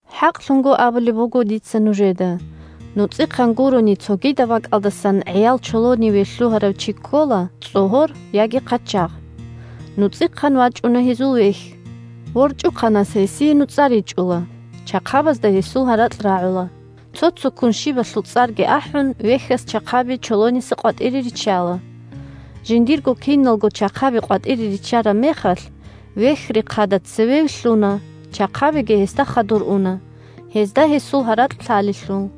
ХӀакълъун абулеб буго дица нужеда: нуцӀихъан гурони, цогидаб бакӀалдасан гӀиял чолониве лъугьарав чи ккола цӀогьор яги хъачагъ. НуцӀихъан вачӀуна гьезул вехь. ВорчӀухъанас гьесие нуцӀа ричӀула, чахъабазда гьесул гьаракь рагӀула. Цо-цоккун щибалъул цӀарги ахӀун, вехьас чахъаби чолониса къватӀире риччала. Жиндирго киналго чахъаби къватӀире риччараб мехалъ, вехь рехъада цеве вилълъуна, чахъабиги гьесда хадур уна, гьезда гьесул гьаракь лъалелъул.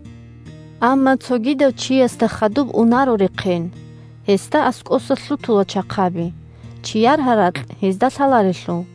Амма цогидав чиясда хадуб унаро рехъен, гьесда аскӀоса лъутула чахъаби, чияр гьаракь гьезда лъаларелъул.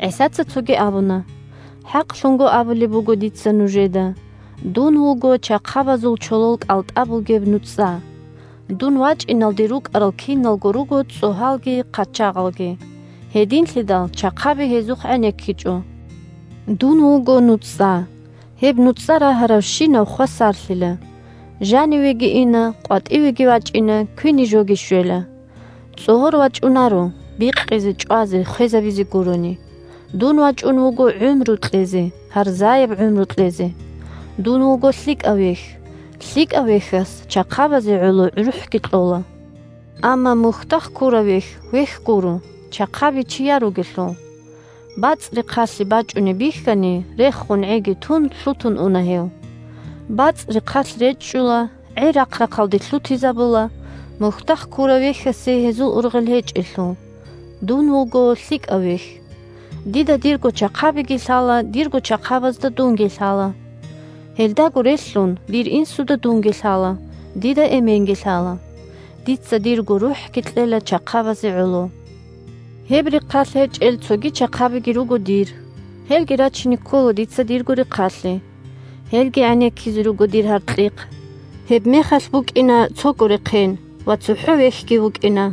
ГӀисаца цоги абуна: – ХӀакълъун абулеб буго дица нужеда: дун вуго чахъабазул чолол кӀалтӀа бугеб нуцӀа. Дун вачӀиналде рукӀарал киналго руго цӀогьалги хъачагъалги. Гьединлъидал чахъаби гьезухъ гӀенеккичӀо. Дун вуго нуцӀа. Гьеб нуцӀа рагьаравщинав хвасарлъила, жанивеги ина, къватӀивеги вачӀина, квине жоги щвела. ЦӀогьор вачӀунаро – бикъизе, чӀвазе, хвезабизе гурони. Дун вачӀун вуго гӀумру кьезе, гьарзаяб гӀумру кьезе. Дун вуго лъикӀав вехь. ЛъикӀав вехьас чахъабазе гӀоло рухӀги кьола. Амма мухьдахъ ккурав вехь вехь гуро, чахъаби чияр ругелъул. БацӀ рехъалъе бачӀунеб бихьани, рехун гӀиги тун, лъутун уна гьев. БацӀ рехъалъ речӀчӀула, гӀи рахъ-рахъалде лъутизабула, мухьдахъ ккурав вехьасе гьезул ургъел гьечӀелъул. Дун вуго лъикӀав вехь. Дида дирго чахъабиги лъала, дирго чахъабазда дунги лъала. Гьелдаго релълъун, дир Инсуда дунги лъала, дида Эменги лъала. Дица дирго рухӀги кьела чахъабазе гӀоло. Гьеб рехъалъ гьечӀел цоги чахъабиги руго дир. Гьелги рачине ккола дица дирго рехъалъе. Гьелги гӀенеккизе руго дир гьаркьихъ. Гьебмехалъ букӀина цого рехъен ва цохӀо вехьги вукӀина.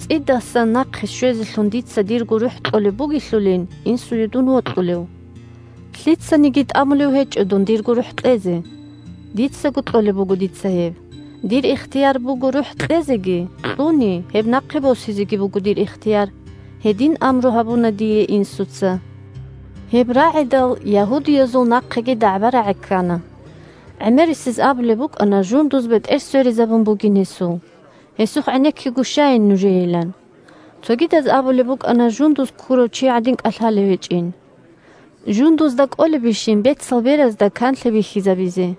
ЦӀидасан нахъе щвезелъун дица дирго рухӀ кьолеб бугелъулин Инсуе дун вокьулев. Лъицаниги тӀамулев гьечӀо дун дирго рухӀ кьезе. Дицаго кьолеб буго дица гьеб. Дир ихтияр буго рухӀ кьезеги, кьуни – гьеб нахъе босизеги буго дир ихтияр. Гьедин амру гьабуна дие Инсуца. Гьеб рагӀидал, ягьудиязул нахъеги дагӀба-рагӀи ккана. ГӀемерисез абулеб букӀана жундуз бетӀер сверизабун бугин гьесул, гьесухъ гӀенеккиго щайин нужеейилан. Цогидаз абулеб букӀана жундуз ккурав чи гӀадин кӀалъалев гьечӀин. Жундузда кӀолебищин бецал беразда канлъи бихьизабизе.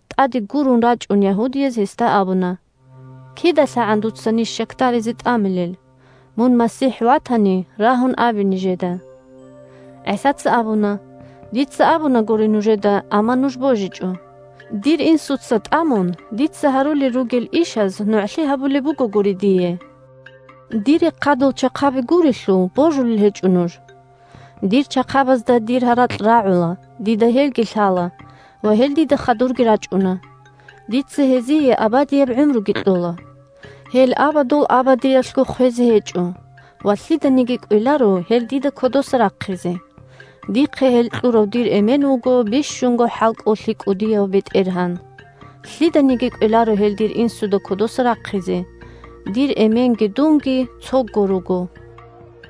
ТӀаде гурун рачӀун, ягьудияз гьесда абуна: – КидалъагӀан дуца ниж щакдаризе тӀамилел? Мун МасихӀ ватани, рагьун абе нижеда! ГӀисаца абуна: – Дица абунагури нужеда, амма нуж божичӀо. Дир Инсуца тӀамун, дица гьарулел ругел ишаз нугӀлъи гьабулеб бугогури дие. Дир рехъадул чахъаби гурелъул, божулел гьечӀо нуж. Дир чахъабазда дир гьаракь рагӀула, дида гьелги лъала ва гьел дида хадурги рачӀуна. Дица гьезие абадияб гӀумруги кьола. Гьел абадул абадиялъго хвезе гьечӀо ва лъиданиги кӀвеларо гьел дида кодоса рахъизе. Дихъе гьел кьурав дир Эмен вуго бищунго хӀалкӀолъи кӀудияв БетӀергьан. Лъиданиги кӀвеларо гьел дир Инсуда кодоса рахъизе. Дир Эменги дунги – цого руго.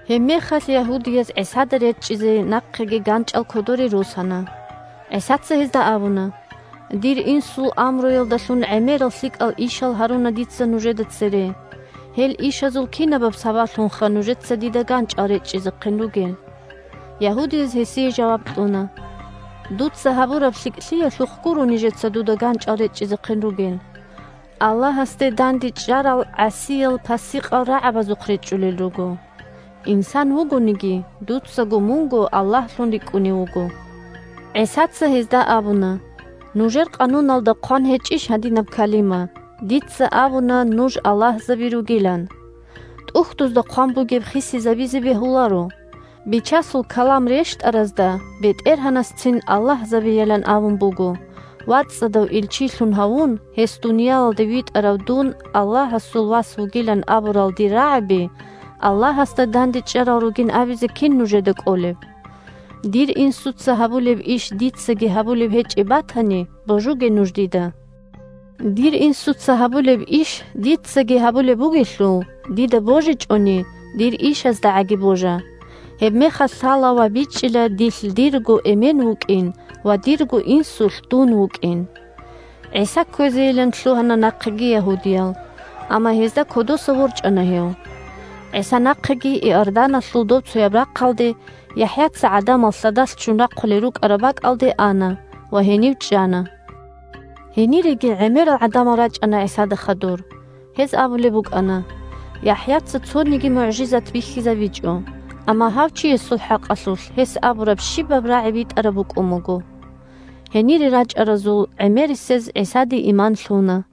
Гьебмехалъ ягьудияз ГӀисада речӀчӀизе нахъеги ганчӀал кодоре росана. ГӀисаца гьезда абуна: – Дир Инсул амруялдалъун гӀемерал лъикӀал ишал гьаруна дица нужеда цере. Гьел ишазул кинабаб сабаблъунха нужеца дида ганчӀал речӀчӀизехъин ругел? Ягьудияз гьесие жаваб кьуна: – Дуца гьабураб лъикӀлъиялъухъ гуро нижеца дуда ганчӀал речӀчӀизехъин ругел. Аллагьасде дандечӀарал гӀасиял-пасикъал рагӀабазухъ речӀчӀулел руго. Инсан вугониги, дуцаго мунго Аллагьлъун рикӀкӀунев вуго. ГӀисаца гьезда абуна: – Нужер къануналда хъван гьечӀищ гьадинаб калима: «Дица абуна нуж аллагьзаби ругилан». ТӀухьдузда хъван бугеб хисизабизе бегьуларо. Бичасул калам рещтӀаразда БетӀергьанасцин аллагьзабийилан абун буго. ВацӀцӀадав илчилъун гьавун, гьес дуниялалде витӀарав Дун Аллагьасул Вас вугилан абурал дир рагӀаби Аллагьасда дандечӀарал ругин абизе кин нужеда кӀолеб? Дир Инсуца гьабулеб иш дицаги гьабулеб гьечӀеб батани, божуге нуж дида. Дир Инсуца гьабулеб иш дицаги гьабулеб бугелъул, дида божичӀони, дир ишаздагӀаги божа. Гьебмехалъ лъала ва бичӀчӀила дилъ дирго Эмен вукӀин ва дирго Инсулъ дун вукӀин. ГӀиса кквезейилан лъугьана нахъеги ягьудиял, амма гьезда кодоса ворчӀана гьев. ГӀиса нахъеги Иорданалъул добцояб рахъалде, ЯхӀяца гӀадамал лъадалъ ччун рахъулел рукӀараб бакӀалде, ана ва гьенив чӀана. Гьениреги гӀемерал гӀадамал рачӀана ГӀисада хадур. Гьез абулеб букӀана: – ЯхӀяца цониги мугӀжизат бихьизабичӀо, амма гьав Чиясул хӀакъалъулъ гьес абураб щибаб рагӀи битӀараб букӀун буго. Гьенире рачӀаразул гӀемерисез ГӀисаде иман лъуна.